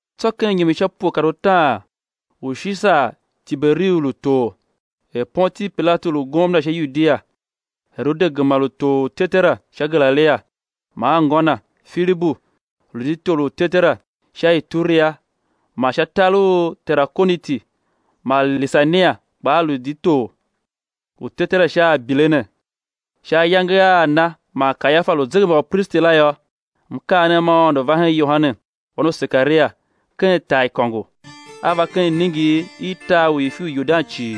Tsô ken inyom i sha pue kar utaan u Shisar Tiberiu lu tor, er Pontiu Pilatu lu gomna sha Yudia, Herode gema lu tor u tetera sha Galilia, man anngô na, Filibu, lu di tor u tetera sha Ituria man sha tar u Terakoniti, man Lisania kpaa lu di tor u tetera sha Abilene, sha ayange a Ana man Kayafa lu uzegembaupristi la yô, mkaanem ma Aôndo va hen Yohane, wan u Sekaria, ken taaikôngo. A va ken iningir i tar u ifi u Yordan cii,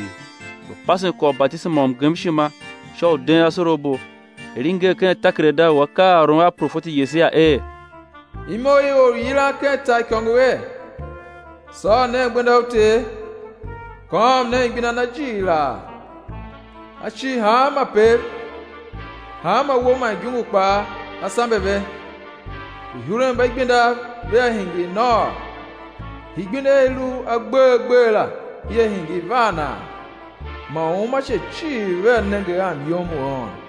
lu pasen kwagh u batisema u mgemshima sha u den asorabo; er i nger ken takerada u akaaôron a profeti Yesaia er: Imo i or u yilan ken taaikôngo er: Sôr nen gbenda u Ter kôôm nen gbenda Na jighilaa. Á cir hanma pev, hanma uwo man igungu kpaa á sambe ve, uihurenmbaigbendav vea hingir nôô, igbenda i i lu agbee agbee la ia hingir vaanaa. Man uumace cii vea nenge a myom u Aôndo.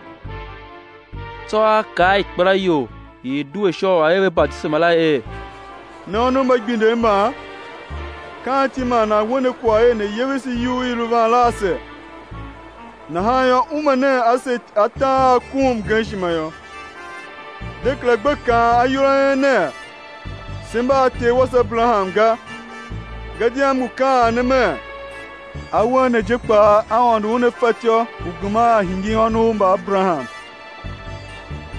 Tsô a kaa a ikpelaior i i due sha u a̱ er ve batisema la er: Ne ônov mba igbindev mban, ka anti man nan we ne kwagh er, ne̱ yevese iyugh i i lu van la ase? Nahan yô, ume nen ase atam a a kom mgemshima yô. De kera gbe kaan ayol a en ner: Se mba a ter wase Aberaham ga, gadia m ngu kaan ne mer, awen ne je kpaa Aôndo Una fatyô u geman a hingir ônov mba Aberaham.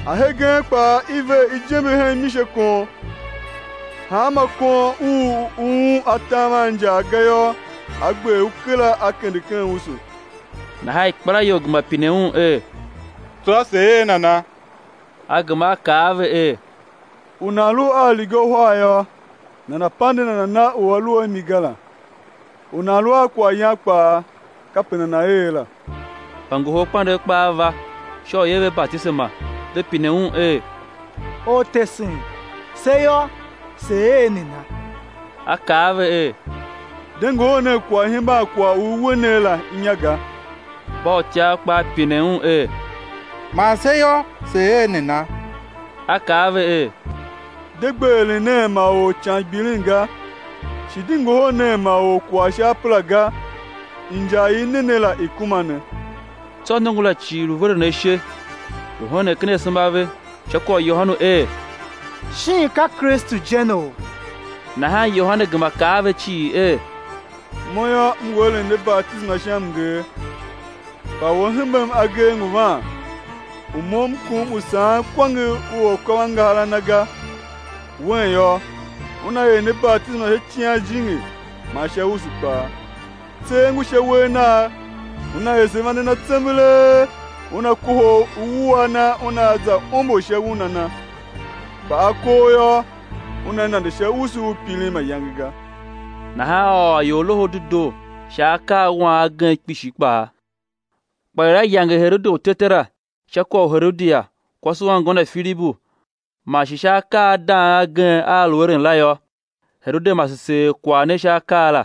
Ahegen kpaa i ver ijembe hen misekon; hanma kon u u um atam a injaa ga yô, á gber u kera, á kende ken usu. Nahan ikpelaior gema pine un er: Tsô sé er nana? A gema a kaa a ve er: U nan lu a uriga uhar yô, nana̱ pande nana na u a lu a mi ga la; U nan lu a kwaghyan kpaa kape nana̱ er la. Mbangoholkpandegh kpaa va, sha u i̱ er ve batisema; ve pine un er: Ortesen se yô, se̱ er nana? A kaa a ve er: De ngohol nen kwagh i̱ hemban kwagh u i we ne la inya ga. Mbautyav kpaa pine un er: Man se yô, se̱ er nana? A kaa a ve er: De gbe eren nen ma or ican gbilin ga, shi de ngohol nen ma or kwagh sha apera ga; injar i i ne ne la i̱ kuma ne. Tsô nongo la cii lu veren ashe, lu henen ken asema a ve sha kwagh u Yohane er: Shin ka Kristu je neou? Nahan Yohane gema kaa a ve cii er: Mo yô, M ngu eren ne batisema sha mnger, kpa u A hembem agee ngu van, u mo m kom u saghen kwange u akôvangahar a Na ga; Wen yô, Una er ne batisema sha Icighan Jijingi man sha usu kpaa. Tser ngu sha uwegh Nagh, Una ese vande Na tsembelee, Una kohol uwua Na Una za ombo sha una Na; kpa akoo yô, Una nande sha usu u pirin mayange ga. Nahan a ôr ior Loho u Dedoo sha akaawan agen kpishi kpaa. Kpa er a yange Herode u tetera sha kwagh u Herodia, kwase u anngô na Filibu, man shi sha akaa a dang agen a a lu eren la yô, Herode mase seer kwagh ne sha akaa la,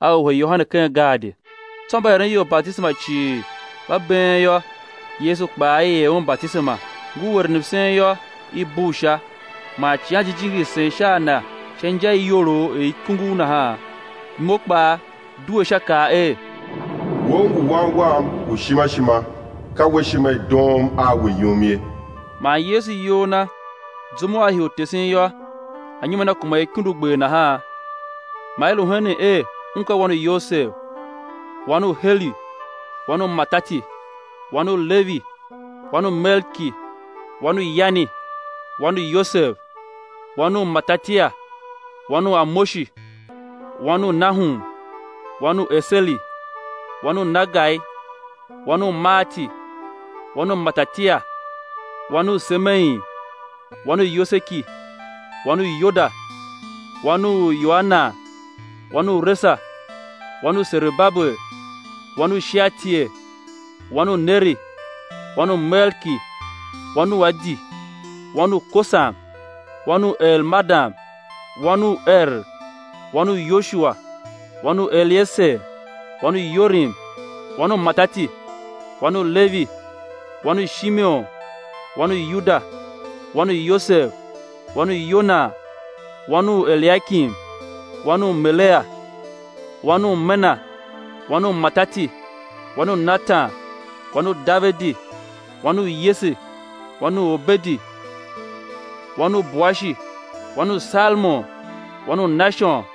a wuhe Yohane ken gaadi. Tsô mba eren ior batisema cii, mba been yô, Yesu kpaa i er Un batisema; ngur eren msen yô, i bugh Sha, man Icighan Jijingi sen sha a Na sha inja i iyolough er ikungugh nahan; imo kpaa due Sha kaa er: We, U ngu Wan Wam u ishima ishima; ka We ishima i doom a We yum ye. Man Yesu iyol Na, zum u A hii u tesen yô, anyom a Na kuma er ikundugber nahan; man i lu henen er Un ka wan u Yosev, wan u Heli, wan u Matati, wan u Levi, wan u Melki, wan u Yani, wan u Yosev, wan u Matatia, wan u Amoshi, wan u Nahum, wan u Eseli, wan u Nagai, wan u Maati, wan u Matatia, wan u Semein, wan u Yoseki, wan u Yoda, wan u Yoanan, wan u Resa, wan u Serubabel, wan u Shealtiel, wan u Neri, wan u Melki, wan u Adi, wan u Kosam, wan u Elmadam, wan u Er, wan u Yosua, wan u Elieser, wan u Yorim, wan u Matati, wan u Levi, wan u Shimeon, wan u Yuda, wan u Yosev, wan u Yonan wan u Eliakim, wan u Melea, wan u Mena, wan u Matati, wan u Natan, wan u Davidi, wan u Yese, wan u Obedi, wan u Boashi, wan u Salmon, wan u Nashon,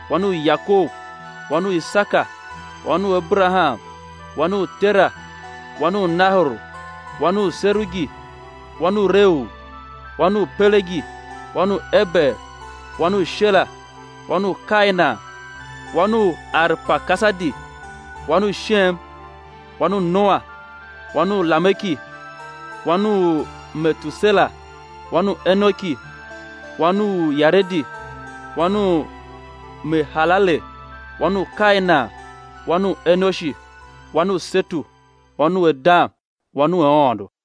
wan u Yakob, wan u Isaka, wan u Aberaham, wan u Tera, wan u Nahor, wan u Serugi, wan u Reu, wan u Pelegi, wan u Eber, wan u Shela, wan u Kainan, wan u Arpakasadi, wan u Shem, wan u Noa, wan u Lameki, wan u Metusela, wan u Enoki, wan u Yaredi, wan u Mehalalel, wan u Kainan, wan u Enoshi, wan u Setu, wan u Adam, wan u Aôndo.